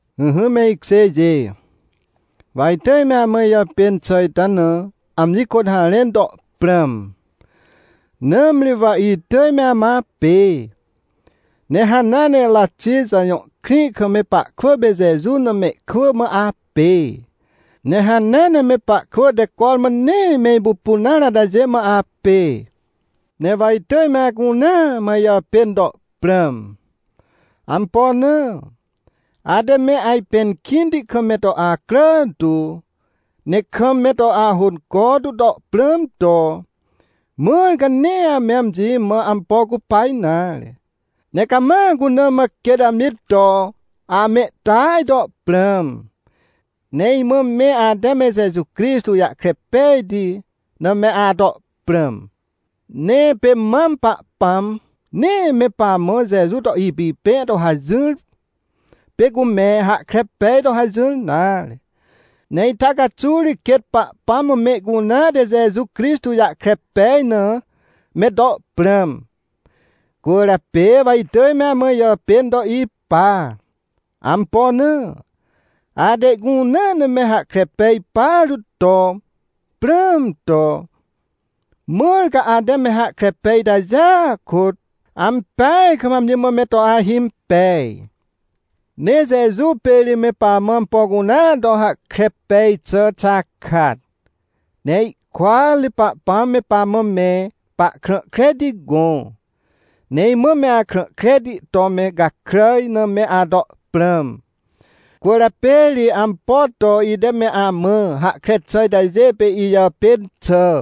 Ỹhỹ me ikjêjê, wa itỳj me amã ijàpên xà ita na amji kôt harẽn to prãm. Nãmri wa itỳj me amã apê, ne hanea Ratixa jõ krĩ kam me pahkwỳ pê Jeju na mehkwỳ mã apê, ne hanea ne me pahkwỳ te cormã nee me ipupun nare atajê mã apê. Ne wa itỳj me acunea mã ijàpên to prãm. Ampo na? Ate me ajpẽn kĩnti kam me to acrà tu, ne kam me to ahônco tu to prãm to. Mãr ca nee ame amji mã ampo cupa nare, ne cama cuna mã quêt amji to amehtỳaj to prãm. Ne imã me ate me Jeju Crixtô jahkre pejti na me ato prãm. Ne pê mam Pahpãm nee me pamã Jeju to ipipẽ to hajỹr, pê cu me hahkre pej to hajỹr nare. Ne ita caxuw ri quêt Pahpãm mã mehcunea te Jeju Crixtô jahkre pej na me to prãm. Cwỳrjapê wa itỳj me amã ijàpên to ipa. Ampo na? Ate ihcunea na me hahkre pej partu to prãm to. Mãr ca ate me hahkre pej itajêa kôt ampeaj kam amji mã me to ahimpej. Ne Jeju pê ri me pamã ampo cunea to hahkre pej xà xakat. Ne ihkôat ri Pahpãm me pamã me pahkrã kreti gõ. Ne imã me akrã kreti to me gakràj na me ato prãm. Cwỳrjapê ri ampo to ite me amã hahkre xà itajê pê ijàpên xà.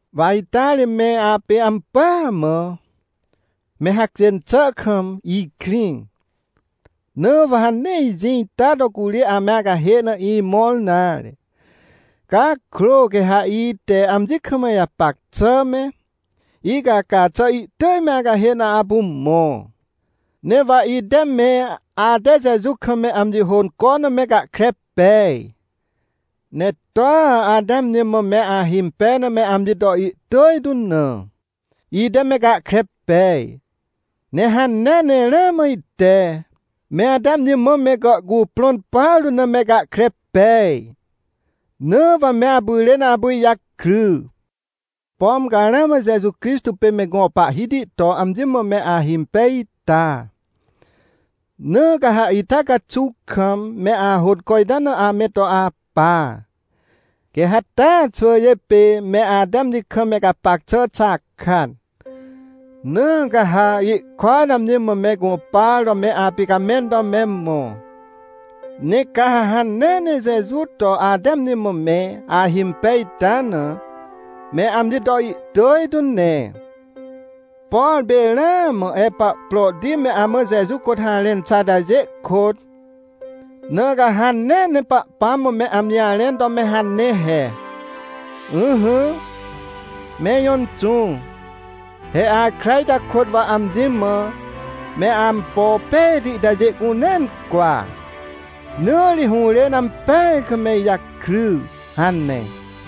Wa ita ri me apê ampỳa mã, me hacjên xà kam ikrĩ, na wa ha nee ijĩ ita to curi ame acahê na imõr nare. Cakrô, quê ha ite amji kam ijapac xà me, icaca xà ihtỳj me acahê na apu mõ. Ne wa ite me ate Jeju kam me amji hônco na me gahkre pej. Ne toa ate amji mã me ahimpej na me amji to ihtỳj tu na, ite me gahkre pej. Ne hanea ne ramã ite, me ate amji mã me gàhcuprõn partu na me gahkre pej. Na wa me apyrên apu ijakry. Pom ca ramã Jeju Crixtô pê me gõ Pahhiti to amji mã me ahimpej ita? Na ca ha ita caxuw kam me ahônco ita na ame to apa, quê ha taa xwỳjê pê me ate amji kam me gapac xà xakat. Na ca ha ihkôat amji mã me gũpar to me apicamẽn to me mõ. Ne ca ha hanea ne Jeju to ate amji mã me ahimpej ita na, me amji to ihtỳj tu ne, por pê ramã Epaprôti me amã Jeju kôt harẽn xà atajê kôt. Na ca ha hanea ne Pahpãm mã me amji jarẽn to me hane he: — Ỹhỹ, me ijõ Inxũ, he akra ita kôt wa amji mã me ampo pejti itajê cunea incwa, na ri hũrên ampeaj kam me ijakry — hane.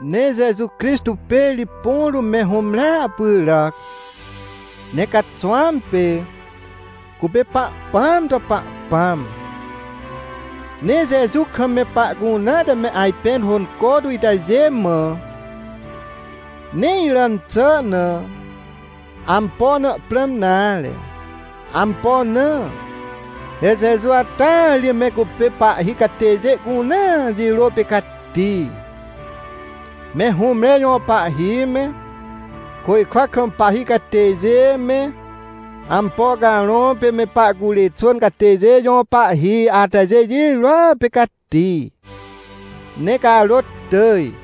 Ne Jeju Crixtô pê ri põ rũm me hũmrea pyràc, ne caxwãm pê, cupê Pahpãam to Pahpãm. Ne Jeju kam me pahcunea te me ajpẽn hônco tu itajê mã, nee iràn xà na, ampo na prãm nare. Ampo na? He Jeju ata ri me cupê pahhi catêjê cunea jirô pê cati, me hũmre jõ pahhi me, côjkwa kam pahhi catêjê me, ampo carõ pê me pahcurê xwỳn catêjê jõ pahhi atajê jirôa pê cati, ne carôt tỳj.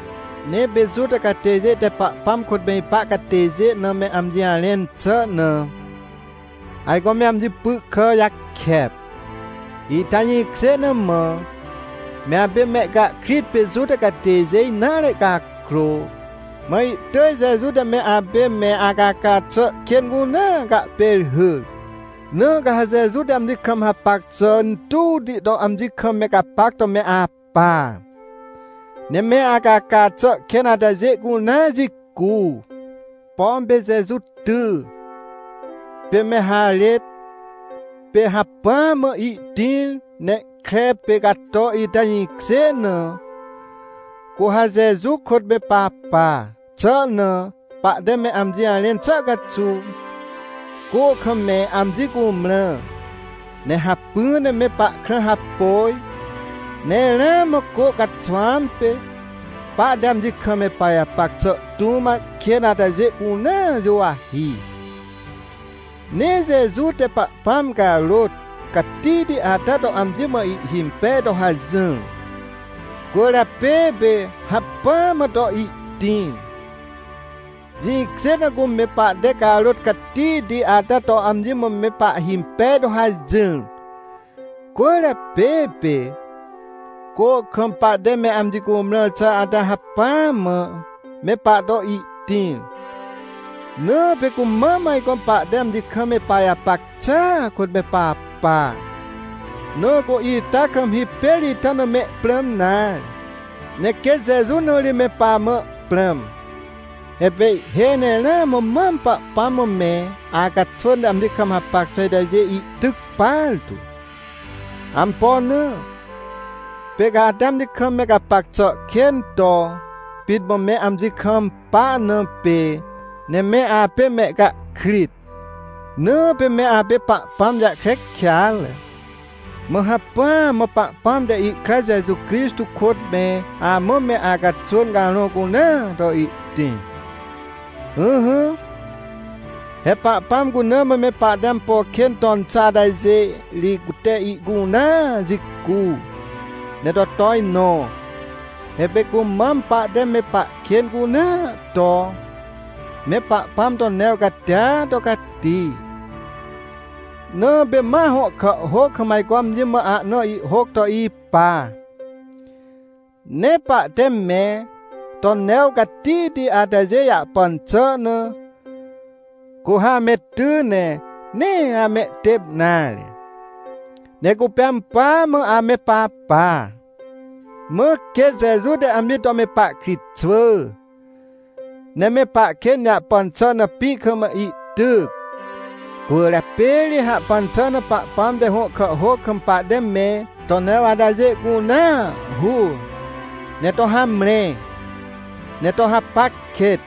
Ne pê Juta catêjê te Pahpãm kôt me ipa catêjê na me amji jarẽn xà na, ajco me amji py kà jakep. Ita jĩkjê na mã, me apê mehcahkrit pê Juta catêjê nare cakrô, mã ihtỳj Jeju te me apê me acaca xà kên cunea cahpêrhyr. Na ca ha Jeju te amji kam hapac xà intuwti to amji kam me gapac to me apa. Ne me acaca xà kên atajê cunea jicu. Pom pê Jeju ty, pê me harêt, pê hacpỹa mã ihtĩr ne kre pê cato ita jĩkjê na, cu ha Jeju kôt me papa xà na, pahte me amji jarẽn xà caxuw, cô kam me amji cumrã, ne hacpỹ ne me pahkrã hapôj, ne ramã cô caxwãm pê, pahte amji kam me pajapac xà tũm kên atajê cunea juwahi. Ne Jeju te Pahpãm carôt catihti ata to amji mã ihhimpej to hajỹr, cwỳrjapê pê hacpỹa mã to ihtĩr. Jĩkjê na cume pahte carôt catihti ata to amji mã me pahhimpej to hajỹr cwỳrjapê, pê cô kam pahte me amji cumrãr xà ata hacpỹa mã me pahto ihtĩr. Na pê cu mam ajco pahte amji kam me pajapac xàa kôt me papa. Na cu ita kam hipêr ita na me prãm nare, ne quêt Jeju na ri me pamã prãm. He pê ihhêj ne ramã mam Pahpãm mã me acaxwỳn te amji kam hapac xà itajê ihtyc partu. Ampo na? Pê ca ate amji kam me gapac xà kên to pit mã me amji kampa na pê. Ne me apê mehcahkrit, na pê me apê Pahpãm jahkre kêatre. Mã hacpỹa mã Pahpãm te ihkra Jeju Crixtô kôt me amã me acaxwỳn carõ cunea to ihtĩr. Ỹhỹ, he Pahpãm cuna mã me pahte ampo kên ton xà atajê ri cute ihcunea jicu, ne to tojnõ. He pê cumam, pahte me pahkên cunea to, me Pahpãm to new catia to cati. Na pê ma hõ kàhhôc kam ajco amji mã ahna ihhôc to ipa. Ne pahte me to new catihti atajê jahpan xà na, cu ha ame ty ne nee amehtêp nare, ne cupê ampỳa mã ame papa. Mã quêt Jeju te amji to me pahkritxwỳ, ne me pahkên jahpan xà na pĩ kam ihtyc. Cwỳrjapê ri hahpan xà na Pahpãm te hõ kàhhôc kam pahte me to new atajê cunea hur, ne to hamre, ne to hapac kêt.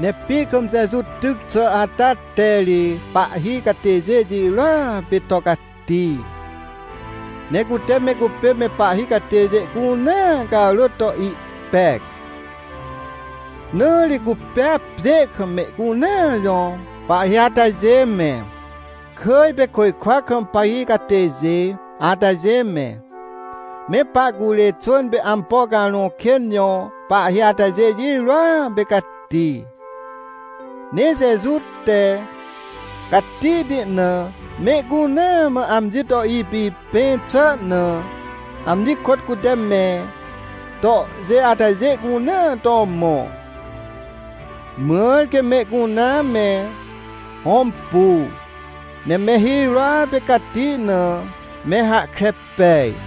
Ne pĩ kam Jeju tyc xà ata te ri pahhi catêjê jirôa pê to cati. Ne cute me cupê me pahhi catêjê cunea carôt to ihpec. Na ri cupêa pjê kam mehcunea jõ pahhi atajê me, kỳj pê côjkwa kam pahhi catêjê atajê me, me pahcurê xwỳn pê ampo carõ kên jõ pahhi atajê jirôa pê cati. Ne Jeju te, catihti na mehcunea mã amji to ipipẽ xà na, amji kôt cute me tohjê atajê cunea to mõ. Mãr quê mehcunea me hõmpu, ne me hirôa pê cati na, me hahkre pej.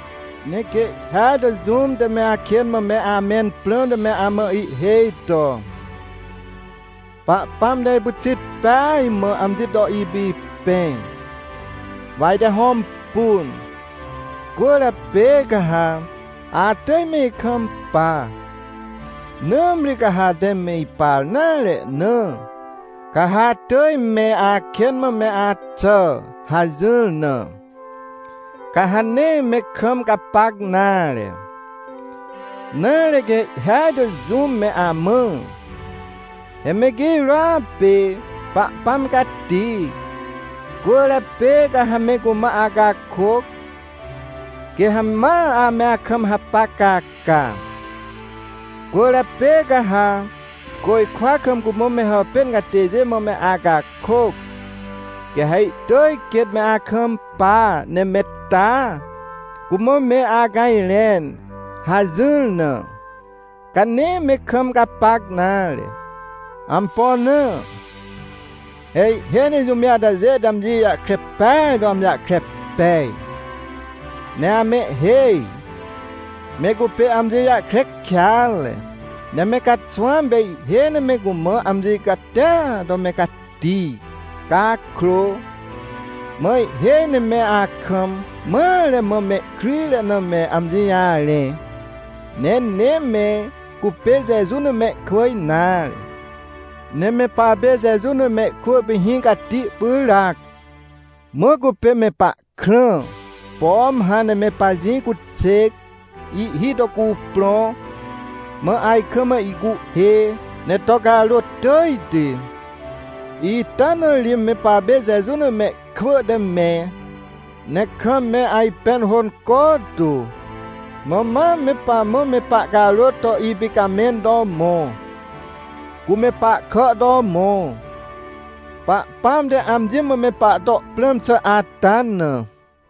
Ne quê ihhêaj to jũm te me akên mã me amẽn prãmte me amã ihhêj to: — Pahpãm te ipyxit peaj mã amji to ipipẽ, wa ite hõmpun, cwỳrjapê ca ha atỳj me ikampa. Nãmri ca ha ate me ipar nare na, ca ha atỳj me akên mã me axà — hajỹr na, ca ha nee me kam gapac nare. Nare, quê ihhêaj to jũm me amã: — He me girôa pê Pahpãm cati, cwỳrjapê ca ha me cumã acakôc, quê ha ma ame akam hapac caca. Cwỳrjapê ca ha côjkwa kam cumã me hàpên catêjê mã me acakôc, quê ha ihtỳj quêt me akampa ne me taa, cumã me acajrẽn — hajỹr na, ca nee me kam gapac nare. Ampo na? He ihhêj ne jũmjê atajê te amji jahkre peaj to amji jahkre pej, ne amehhêj. Me cupê amji jahkre kêatre. Ne me caxwãm pê ihhêj ne me cumã amji catia to me cati cakrô, mã ihhêj ne me akam mare mã mehkryjre na me amji jarẽ. Ne nee me cupê Jeju na mehkwỳ nare. Ne me papê Jeju na mehkwỳ pê hĩ cati pyràac. Mã cupê me pahkrã. Pom hãn ne me pajĩ cuxêc ihhi to cuprõ, mã ajkam ihcuhhê, ne to carôt tỳjti, ita na ri me papê Jeju na mehkwỳ te me, ne kam me ajpẽn hônco tu. Mã ma me pamã me pahcarôt to ipicamẽn to mõ, cu me pahkà to mõ, Pahpãm te amji mã me pahto prãm xà ata na.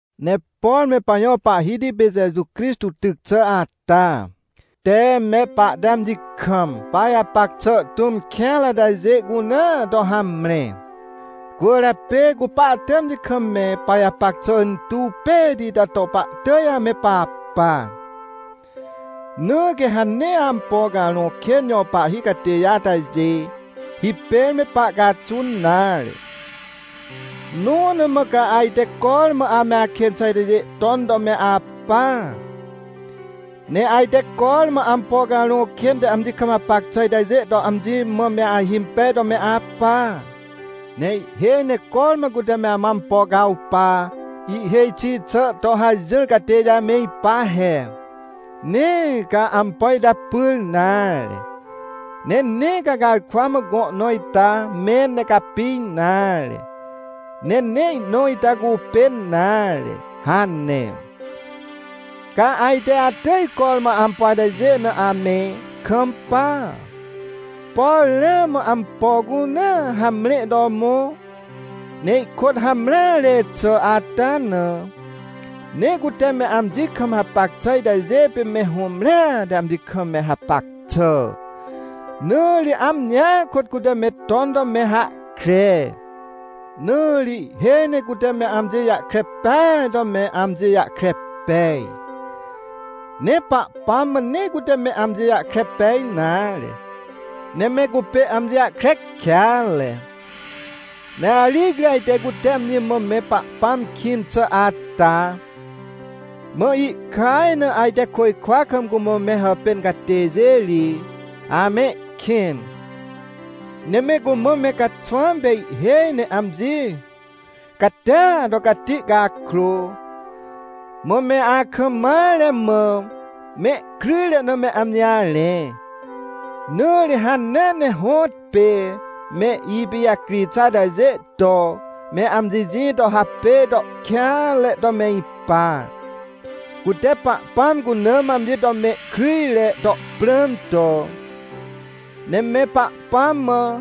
Ne por me pajõ Pahhiti pê Jeju Crixtô tyc xà ata te me pahte amji kam pajapac xà tũm kêanre atajê cunea to hamre. Cwỳrjapê cu pahte amji kam me pajapac xà intuw pejti ita to pahtỳj ame papa. Na quê ha nee ampo carõ kên jõ pahhi catêjê atajê hipêr me pahcaxun nare. Nõ na mã ca ajte cormã ame akên xà itajê ton to me apa? Ne ajte cormã ampo carõ kên te amji kam hapac xà itajê to amji mã me ahimpej to me apa? Ne ihhêj ne cormã cute me amã ampo cawpa ihhêj xi xà to hajỹr catêjê ame ipa he: — Nee ca ampo ita pyr nare, ne nee ca garkwa mã gõ nõ ita mẽn ne capi nare, ne nee ihnõ ita cupên nare — hane. Ca ajte atỳj cormã ampo atajê na ame kampa? Por ramã ampo cunea hamre to mõ, ne ihkôt hamreare xà ata na? Ne cute me amji kam hapac xà itajê pê me hũmrea te amji kam me hapac xà, na ri amjia kôt cute me ton to me hahkre. Na ri ihhêj ne cute me amji jahkre peaj to me amji jahkre pej. Ne Pahpãm mã nee cute me amji jahkre pej nare, ne me cupê amji jahkre kêatre. Ne aricri ajte cute amji mã me Pahpãm kĩn xà ata. Mã ihkaj na ajte côjkwa kam cumã me hàpên catêjê ri amehkĩn. Ne me cumã me caxwãm pê ihhêj ne amji catia to cati cakrô, mã me akam mare mã mehkryjre na me amji jarẽ. Na ri hanea ne hõtpê me ipijacri xà atajê to, me amji jĩ to hapêj to kêanre to me ipa, cute Pahpãm cuna mã amji to me kryjre to prãm to. Ne me Pahpãm mã,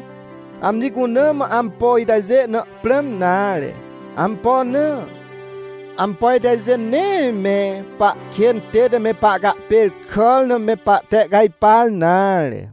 amji cuna mã ampo itajê na prãm nare. Ampo na? Ampo itajê nee me pahkên tête me pahcahpêrkàr na me pahtehcajpar nare.